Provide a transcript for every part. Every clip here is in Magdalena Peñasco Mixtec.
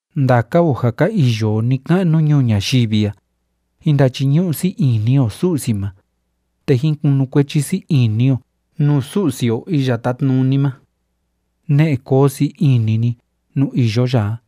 Ndaka o ja ka iyo o ni‑ka'nu ñuu ñayivi a, jín ndachiñu'u sii ini o Su'si ma, te jín kunukuechi sii ini o nuu Su'si o Iya Tátnuni ma. Ne'e koo sii ini ni nuu iyo ya a.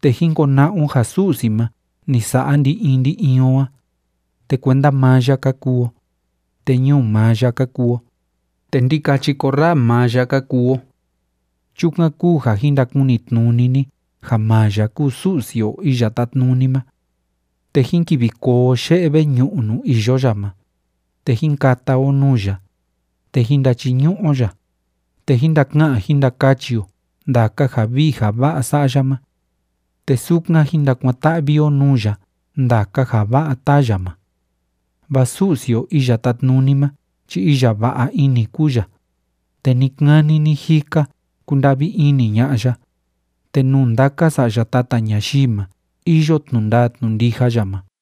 Te jín kona'a o ja Su'si ma ni sa'a ndi‑in ndi‑in o a, te kuenda maa ya ka kuu o, te ñuu maa ya ka kuu o, te ndikachi korraa maa ya ka kuu o. Chukan kúu ja jin ndakunitnuni ni ja maa ya kúu Su'si o Iya Tátnuni ma. Te jín kivi koo o ye'e veñu'u nuu iyo ya ma, te jín kata o nuu ya, te jín ndachiñu'u o ya, te jín ndaka'an jín ndakachi o ndaka ja vii ja va'a sa'a ya ma. Te sukan jín ndakuan‑ta'vi o nuu ya ndaka ja va'a táa ya ma. Vaa Su'si o Iya Tátnuni ma chi iya va'a ini kúu ya, te ni‑kani ni‑jika kúnda'vi ini ña'a ya, te nuu ndaka sa'ya tata ñayii ma iyo tnu'u ndaa tnu'u ndija ya ma.